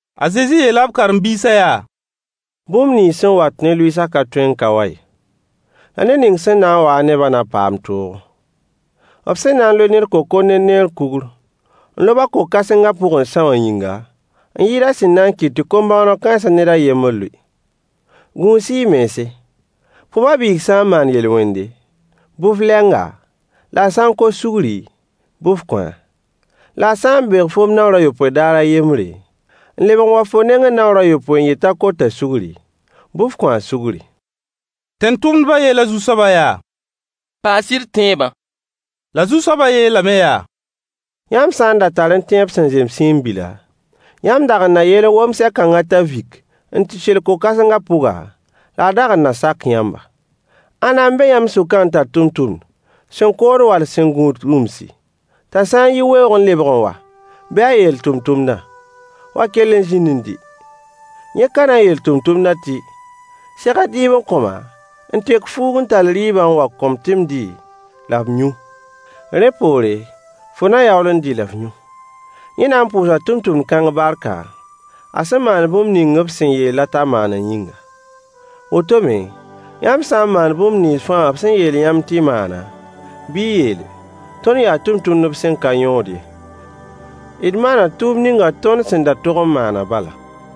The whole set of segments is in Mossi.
A Zezi yeel a b karen-biisã yaa: Bũmb nins sẽn wat ne lʋɩɩsã ka tõe n ka wa ye. La ned ning sẽn na n wa-a ne-bã na paam toogo. B sẽn na loe ned kokor ne neer kugr n lob-a ko-kãsenga pʋg n são a yĩnga, n yɩɩd a sẽn na n kɩt tɩ kom-bõoneg kãens ned a yembr lʋɩ. Gũus-y y mense. Fo ba-biig sã n maan yel-wende, bɩ f leng-a, la a sã n kos sugri, bɩ f kõ-a. La a sã n beeg foom naoor a yopoe daar a yembre, n lebg n wa fo nengẽ naoor a yopoe n yet t'a kota sugri, bɩ f kõ-a sugri. Tẽn-tʋmdba yeela Zu-soabã yaa: Paas-y d tẽebã. La Zu-soabã yeelame yaa: Yãmb sã n da tarẽ tẽeb sẽn zem siin-bila, yãmb dag n na yeel wom-sɛ-kãngã t'a vik n tɩ sel ko-kãsengã pʋga, la a dag n na sak yãmba. Ãnna n be yãmb sʋkã n tar tʋmtʋmd sẽn kood wall sẽn gũud rũmsi, t'a sã n yi weoog n lebg n wa bɩ a yeel tʋmtʋmdã: wa kell n zĩnd n dɩ? Yẽ ka na n yeel tʋmtʋmdã tɩ: Segl dɩɩb n kõ-ma n tek fuug n tall rɩɩbã n wa n kõ-m tɩ m dɩ la m yũ. Rẽ poore fo na yaool n dɩ la f yũ? Yẽ na n pʋʋsa tʋmtʋmd-kãng barka, a sẽn maan bũmb ninga b sẽn yeel-a t'a maana yĩnga? Woto me, yãmb sã n maan bũmb nins fãa b sẽn yeel yãmb tɩ y maana, bɩ y yeele: Tõnd yaa tʋmtʋmdb sẽn ka yõod ye, d maana tʋʋmd ninga tõnd sẽn da tog n maanã bala.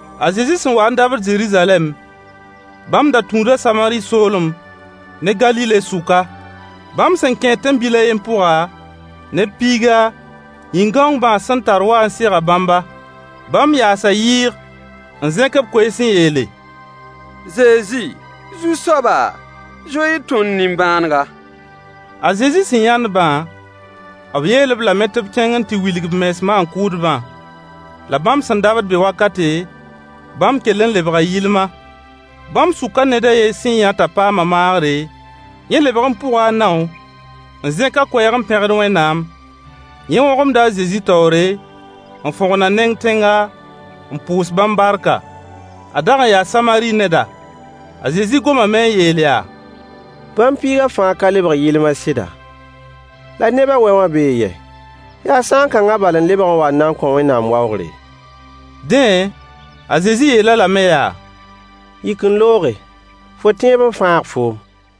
A Zezi sẽn wa n dabd Zeruzalɛm, bãmb da tũuda Samari soolem ne Galile sʋka. Bãmb sẽn kẽed tẽn-bil a yen pʋga, neb piiga yĩn-gãong bãas sẽn tar waa n sega bãmba. Bãmb yaasa yɩɩg n zẽk b koees n yeele: Zezi, Zu-soaba, zoe-y tõnd nimbãanega. A Zezi sẽn yãnd-bã, b yeel-b lame tɩ b kẽng n tɩ wilg b mens maan-kʋʋdbã. La bãmb sẽn dabd be wakate, bãmb kell n lebga yɩlma. Bãmb sʋka ned a yen sẽn yã t'a paama maagre, yẽ lebg n pʋga a nao, n zẽk a koɛɛg n pẽgd Wẽnnaam. Yẽ wõgemda a Zezi taoore, n fõgn a neng tẽnga, n pʋʋs bãmb barka. A dag n yaa Samari neda. A Zezi gomame n yeel yaa: Bãmb piiga fãa ka lebg yɩlma sɩda? La neb a wɛ wã bee yɛ? Yaa sãan-kãnga bal n lebg n wa n na kõ Wẽnnaam waoogre? Dẽ a Zezi yeel-a lame yaa: yik n looge. Fo tẽeb n fãag foom.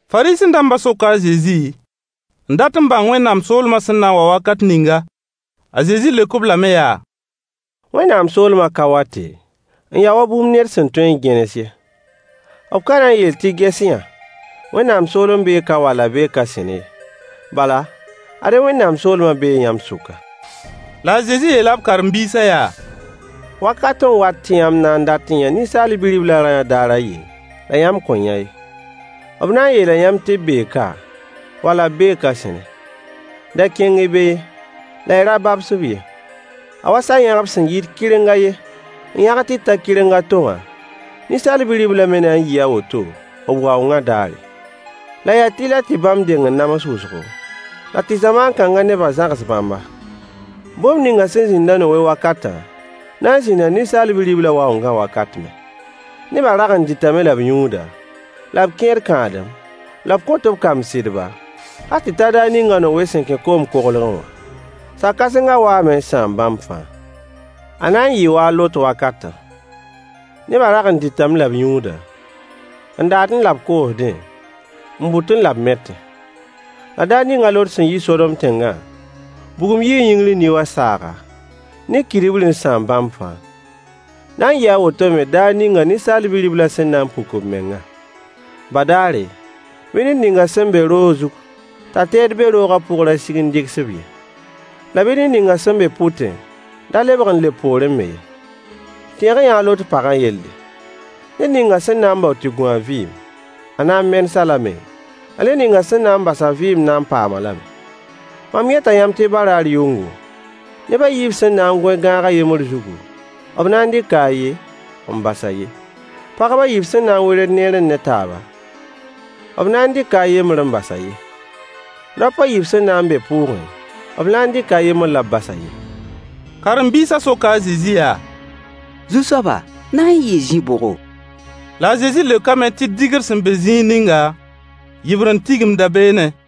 Fariisẽ-dambã soka a Zezi n dat n bãng Wẽnnaam soolmã sẽn na n wa wakat ninga. A Zezi leok-b lame yaa: Wẽnnaam soolmã ka wate, n ya wa bũmb ned sẽn tõe n gẽnes ye. B ka na n yeel tɩ ges-y-yã! Wẽnnaam soolem bee ka wall a bee ka sẽne ye. Bala, ad-y Wẽnnaam soolmã bee yãmb sʋka. La a Zezi yeela b karen-biisã yaa: Wakat n wat tɩ yãmb na n dat n yã Ninsaal Bi-riblã rayã daar a yen la yãmb kõn yã ye. B na n yeela yãmb tɩ b bee ka, wala b bee ka sẽne. Da kẽng-y be ye, la y ra babs-b ye. A wa sa-yãgb sẽn yit kɩreng a yen n yãg n tɩ ta kɩreng a to wã, Ninsaal Bi-riblã me na n yɩɩ a woto b waoongã dãare. La yaa tɩlɛ tɩ bãmb deng n nams wʋsgo, la tɩ zamaan kãnga nebã zãgs bãmba. Bũmb ninga sẽn zĩnd a Nowe wakatã na n zĩnda Ninsaal Bi-riblã waoongã wakat me. Nebã rag n dɩtame la b yũuda, la b kẽed kãadem, la b kõt b kamb sɩdba, hal tɩ ta daar ninga a Nowe sẽn kẽ koom koglgẽ wã. Sa-kãsenga waame n sãam bãmb fãa. A na n yɩɩ wa a Lot wakatã. Nebã rag n dɩtame la b yũuda, n daadẽ la b koosdẽ, n bʋtẽ la b metẽ. La daar ning a Lot sẽn yi Sodom tẽngã, bugum yii yĩngr n ni wa saaga, ne kidbri n sãam bãmb fãa. Na n yɩɩ a woto me daar ning Ninsaal Bi-riblã sẽn na n puk b mengã. Badaare, bɩ ned ninga sẽn be roog zug t'a teed be roogã pʋg ra sig n dɩgs-b ye. La bɩ ned ninga sẽn be pʋtẽ da lebg n leb poorẽ me ye. Tẽeg-y-yã a Lot pagã yelle. Ned ninga sẽn na n bao tɩ gũ a vɩɩm, a na n menes-a lame, la ned ning sẽn na bas a vɩɩm na n paam-a lame. Mam yeta yãmb tɩ baraar yʋngo, neb a yiib sẽn na n goẽ gãag a yembr zugu, b na n dɩka a ye, n bas a ye. Pagb a yiib sẽn na n werd neerẽ ne taaba, b na n dɩka a yembr n bas a ye. [ Raop a yiib sẽn na n be pʋʋgẽ, b na n dɩka a yembr la b bas a ye.] Karen-biisã soka a Zezi yaa: Zu-soaba, na n yɩɩ zĩ-bʋgo? La a Zezi leokame tɩ dɩgr sẽn be zĩig ninga, yɩbrend tigimda beene.